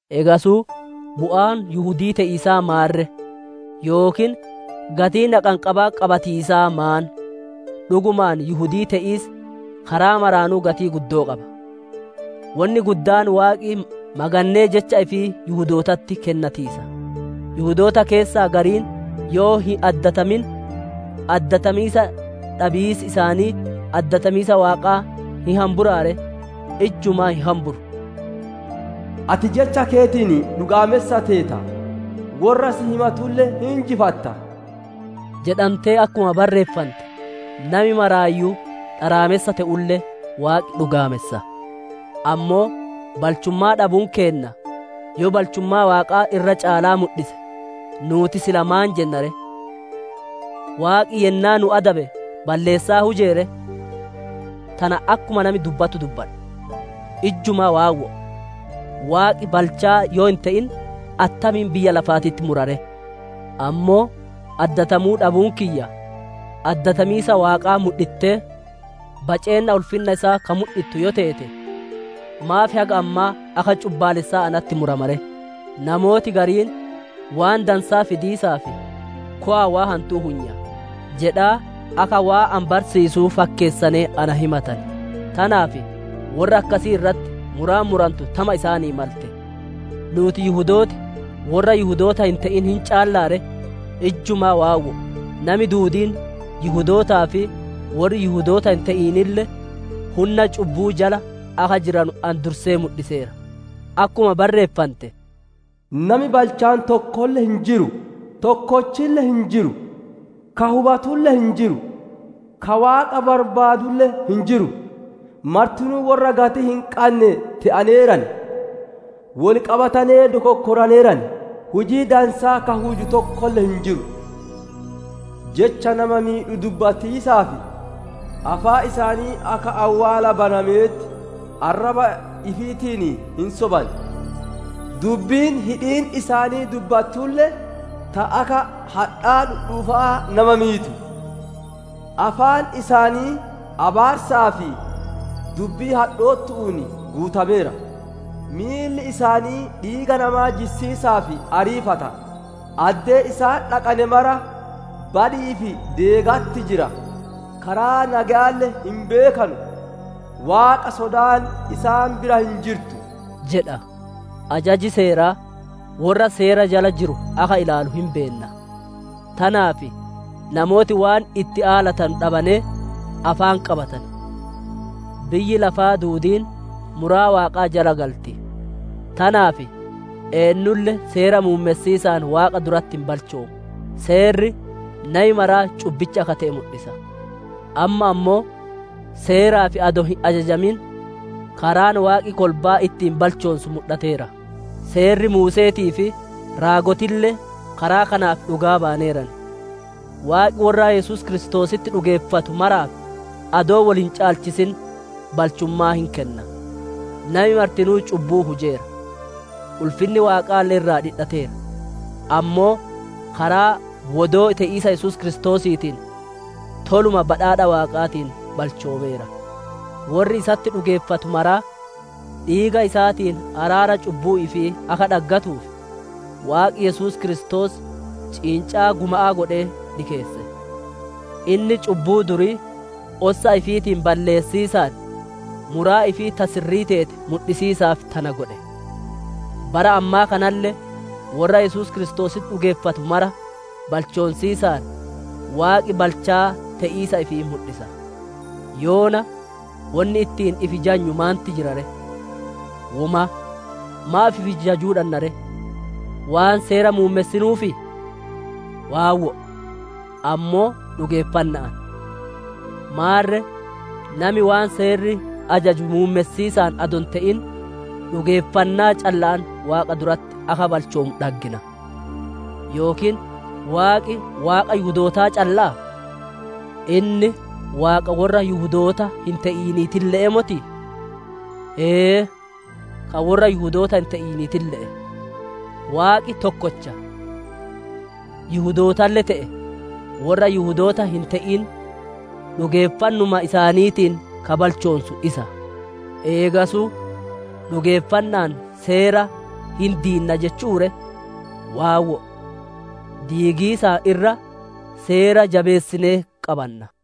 Eegasuu bu'aan Yihudii te'iisaa maan ree? Yookiin gatiin haqanqabaa qabatiisaa maan? Dhugumaan Yihudii te'iis karaa maraanuu gatii guddoo qaba! Wonni guddaan Waaqi magannee jecha ifii Yihudootatti kennatiisa. Yihudoota keessaa gariin yoo hin addatamin, addatamiisa dhabiisi isaanii addatamiisa Waaqaa hin hamburaa ree? Ijjumaa hin hamburu! «Ati jecha keetiin dhugaamessa teeta; worra si himatulle hin injifatta» jedhantee akkuma barreeffante, nami maraayyuu dharaamessa te'ulle, Waaqi dhugaamessa. Ammoo balchummaa dhabuun keenna yoo balchummaa Waaqaa irra caalaa mudhise, nuuti silaa maan jenna ree? Waaqi yennaa nu adabe balleessaa hujee ree? Tana akkuma nami dubbatu dubbadha. Ijjumaa waawwo'o! Waaqi balchaa yoo hin te'in, attamiin biyya lafaatitti mura ree? Ammoo addatamuu dhabuun kiyya addatamiisa Waaqaa mudhittee, baceenna ulfinna isaa ka mudhittu yoo teete, maaf haga ammaa akka cubbaalessaa natti murama ree? Namooti gariin, «Waan dansaa fidiisaaf, kowa'a waan hantuu huyna» jedhaa akka waan ani barsiisuu fakkeessanee na himatan; tanaaf worra akkasii irratti muraan murantu tama isaanii malte. Nuuti Yihudooti worra Yihudoota hin te'in hin caallaa ree? Ijjumaa waawwo'o! Nami duudiin Yihudootaa fi worri Yihudoota hin te'inille hunna cubbu'uu jala akka jiranu ani dursee mudhiseera. Akkuma barreeffante: «Nami balchaan tokkolle hin jiru, tokkolle hin jiru; ka hubatulle hin jiru; ka Waaqa barbaadatulle hin jiru. Martinuu worra gatii hin qanne te'aneeran; wol qabatanee dokonkoraneeran. Hujii dansaa ka huju tokkolle hin jiru; Jecha nama miidhu dubbatiisaaf, afaan isaanii akka awwaala banamee ti; arraba ifiitiin hin soban; dubbiin hidhiin isaanii dubbattulle ta akka hadhaa dhudhuufa'aa nama miitu; afaan isaanii abaarsaa fi dubbii hadhoottu'uun guutameera. Miilli isaanii dhiiga namaa jissiisaaf ariifata; addee isaan dhaqane mara badi'ii fi deegatti jira. Karaa nageyaalle hin beekanu; Waaqa sodaan isaan bira hin jirtu» jedha. Ajaji Seeraa worra Seera jala jiru akka ilaalu hin beenna; tanaaf namooti waan itti aalatanu dhabanee afaan qabatan; biyyi lafaa duudiin muraa Waaqaa jala galti. Tanaaf eennulle Seera muummessiisaan Waaqa duratti hin balchoomu; Seerri nami maraa cubbicha akka te'e mudhisa. Amma ammoo, Seeraaf adoo hin ajajamin karaan Waaqi kolbaa ittiin balchoonsu mudhateera; Seerri Muuse'eetii fi Raagotille karaa kanaaf dhugaa bayaneeran. Waaqi worra Yesuus Kiristoositti dhugeeffatu maraaf adoo wol hin caalchisin balchummaa hin kenna. Nami martinuu cubbuu hujeera; ulfinni Waaqaalle irraa dhidhateera. Ammoo karaa wodoo te'iisa Yesuus Kiristoosiitiin toluma badhaadha Waaqaatiin balchoomeera. Worri isatti dhugeeffatu maraa dhiiga isaatiin araara cubbuu ifii akka dhaggatuuf, Waaqi Yesuus Kiristoos ciincaa guma'aa godhee dhikeesse. Inni cubbuu durii ossa ifiitiin balleessiisaan muraa ifii ta sirrii teete mudhisiisaaf tana godhe. Bara ammaa kanalle, worra Yesuus Kiristoositti dhugeeffatu mara balchoonsiisaan, Waaqi balchaa te'iisa ifii mudhisa. Yoona wonni ittiin ifi jajnu maanti jira ree? Womaa! Maaf ifi jajuu dhanna ree? Waan Seera muummessinuufii? Waawwo'o; ammoo dhugeeffanna'aan. Maarre nami waan Seerri ajaju muummessiisaan adoo hin te'in, dhugeeffannaa calla'aan Waaqa duratti akka balchoomu dhaggina. Yookiin Waaqi Waaqa Yihudootaa calla'aa? Inni Waaqa worra Yihudoota hin te'iniitille'ee motii? Ee, ka worra Yihudoota hin te'iniitille'e. Waaqi tokkocha; Yihudootalle te'e, worra Yihudoota hin te'in dhugeeffannuma isaaniitiin ka balchoonsu isa. Eegasuu dhugeeffanna'aan Seera hin diinna jechu'uu ree? Waawwo'o; diigiisaan irra, Seera jabeessinee qabanna.